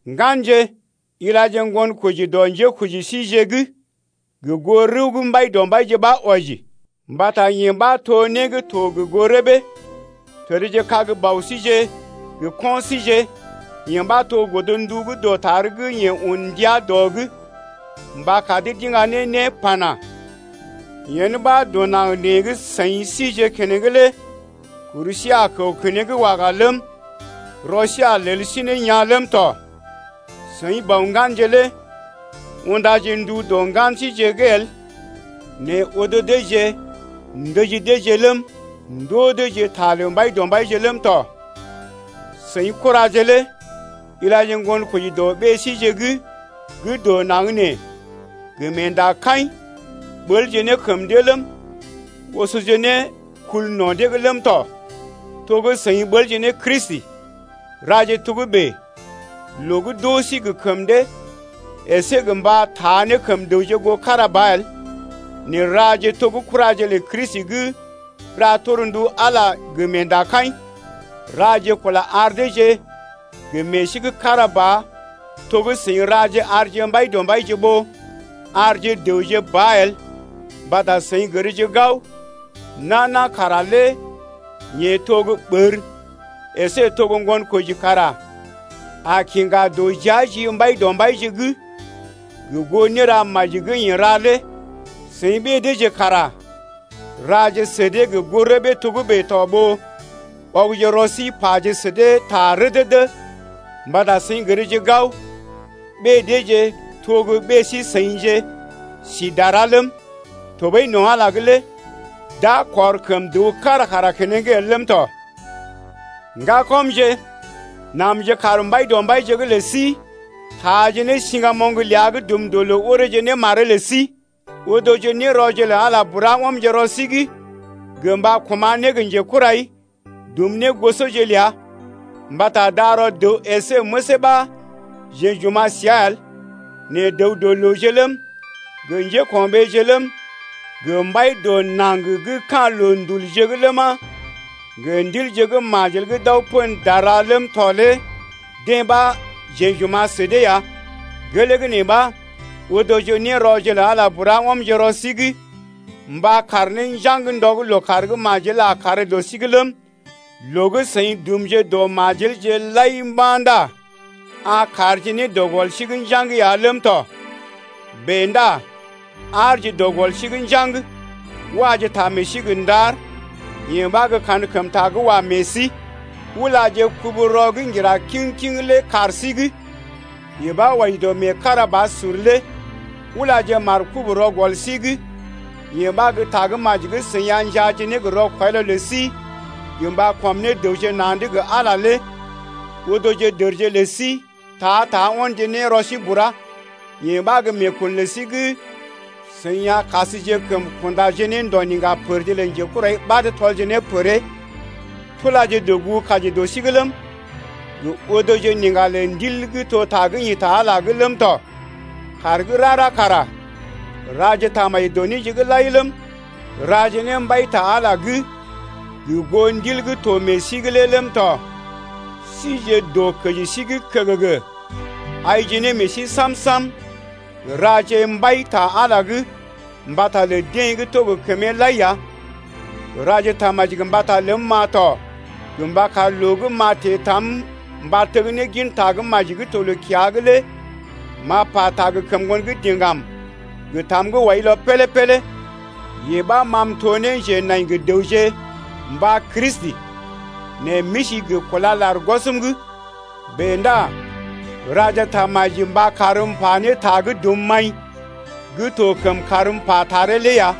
Ŋganje, ilaje ŋgonkoji dɔ njékoji síje’g gə goo rəw gə́ Mbaidɔmbaije ɓa wɔji mbata yee ɓa to né gə́ to gə goo rəbee. Təd kag bɔbije gə kɔinje. Yee ɓa to godndu gə́ dɔtar gə́ yeḛ un ndia dɔ’g mba kar dee d’iŋga ne né pana: Yen ɓa dɔ naŋg nee gə́ seḭ sije keneŋ lé kur sí a kəw keneŋ waga ləm, rɔ sí a lel sí ne yaa̰ ləm tɔ. Seḭ, bɔ ŋganje lé undaje ndu dɔ ŋgan síje’g el nɛ odo deeje ndəji deeje ləm, ndoo deeje ta lə Mbaidɔmbaije ləm tɔ. Seḭ kuraje lé ilaje ŋgonkoji dɔ ɓée síje’g gə́ dɔ naŋg nee gə meendakaḭ, ɓəlje ne kəm dee ləm, osoje ne kul no̰ dee’g ləm tɔ, to gə́ seḭ ɓəlje ne Kristi. Raje togə́bè loo gə́ d’oo sí gə kəm dee əsé gə mba taa ne kəm dəwje goo kára ba el nɛ raje to gə́ kuraje lə Kristi gə́ ra torndu Ala lé gə meendakaḭ. Raje kula ar deeje gə meḛ sí gə́ kára ba to gə́ seḭ raje arje Mbaidɔmbaije ɓó arje dəwje ba el, mbata seḭ gərje gao, nana kara lé yeḛ to gə́ ɓər əsé to gə́ ŋgonkoji kara a kiŋga dɔjia ji Mbaidɔmbaije’g gə goo néra maji gə́ yeḛ ra lé. Seḭ ɓée deeje kara raje sə dee gə goo rəbee togə́bè to ɓó ɔgje rɔ sí paje sə dee ta rədədə mbata seḭ gərje gao ɓée deeje to gə ɓée sí-seḭje sí dara ləm, tɔɓəi no̰ Ala’g lé d’a kɔr kəm dəw kára kara keneŋ el ləm tɔ. Ŋgakɔmje, namje kaar Mbaidɔmbaije’g lə sí taaje ne siŋgamoŋ ləa gə́ dum dɔ loo oreeje ne maree lə sí. Odoje nérɔje lə Ala bura ɔmje rɔ sí’g gə mba koma̰ ne gə njekurai dum ne négosɔje ləa. Mbata darɔ dəw əsé məsee ɓa jeḛ j’oma̰ səa el, nɛ dəw-dɔ-looje ləm, gə njéko̰ɓeeje ləm, gə mbai dɔ naŋg gə́ ka̰ loondul’gje ləma, gə ndilje gə́ majel gə́ d’aw pən dara’g ləm tɔ lé deḛ ɓa jeḛ j’oma̰ sə dee ya. Gelee gə́ nee ɓa, odoje nérɔje lə Ala bura, ɔmje rɔ sí’g mba kaar ne njaŋg ndɔ gə́ lookàr gə́ majel a kàr dɔ sí’g ləm, loo gə́ seḭ dumje dɔ majelje lai mba̰ ndá a kaarje ne dɔ gɔl sí’g njaŋg ya ləm tɔ. Bèe ndá aarje dɔ gɔl sí’g njaŋg, waje ta meḛ sí gə ndar, yee ɓa gə́ kankəmta gə́ wa meḛ sí. Ulaje kubu-rɔ gə́ ŋgira kiŋ-kiŋ lé kaar sí’g, yee ɓa wɔji dɔ meekarabasur lé. Ulaje markob-rɔ gɔl sí’g, yee ɓa gə́ Tagə́maji gə́ seḭ a njaaje ne gə rɔkwɔilɔ lə sí gə mba kɔm ne dəwje na̰’d gə Ala lé. Odoje dərje lə sí ta-ta ɔnje ne rɔ sí bura, yee ɓa gə́ meekun lə sí gə́ seḭ a kasjekəm kunda ne ndo̰ niŋga pərje lə njekurai ɓad tɔlje ne pəree. Tulaje dɔgugu-kaji dɔ sí’g ləm, gə odoje niŋga lə Ndil gə́ to ta gə́ ḭ ta Ala’g lé ləm tɔ. Kàr gə́ rara kara raje tamaji dɔ néje’g lai ləm, raje ne mbai ta Ala’g gə goo Ndil gə́ to meḛ sí’g lé ləm tɔ. Sije dɔ kəji sí’g kəgəgə aije ne meḛ sí sam-sam raje mbai ta Ala’g mbata lə deḛ gə́ to gə kəmee lai ya. Raje tamaji mbata ləm-ma tɔ gə mba kar loo gə́ m’a teḛ tam mba teg ne gin Tagə́maji gə́ to loo-kiya’g lé m’a pata gə kəm ŋgondiŋgam gə tam gə́ wɔilɔ pélé-pélé, Yee ɓa ma m’to ne njenai gə dəwje mba Kristi nɛ m’isi gə kúla lar gwɔsm’g. Bèe ndá raje tamaji mba karm m’pa ne ta gə́ dum maḭ gə́ to kəm karm m’pa taree lé ya.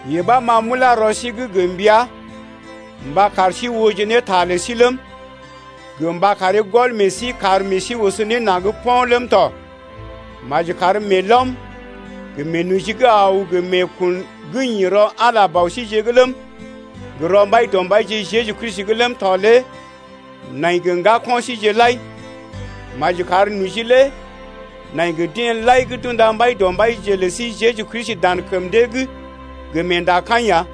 Yee ɓa ma m’ulá rɔ sí’g gə mbəa mba kar sí ooje ne ta lə sí ləm, gə mba karee gɔl meḛ sí kar meḛ sí oso ne naŋg po̰ ləm tɔ. Maji kar meelɔm, gə meenoji gə́ aw gə meekun gə́ ḭ rɔ Ala Bɔ síjeḛ ləm, gə rɔ Mbaidɔmbaije Jeju Kristi ləm tɔ lé nai gə ŋgako̰ síjeḛ lai! Maji kar noji lé nai gə deḛ lai gə́ d’unda Mbaidɔmbaije lə sí Jeju Kristi dan kəm dee’g gə meenda kaḭ ya!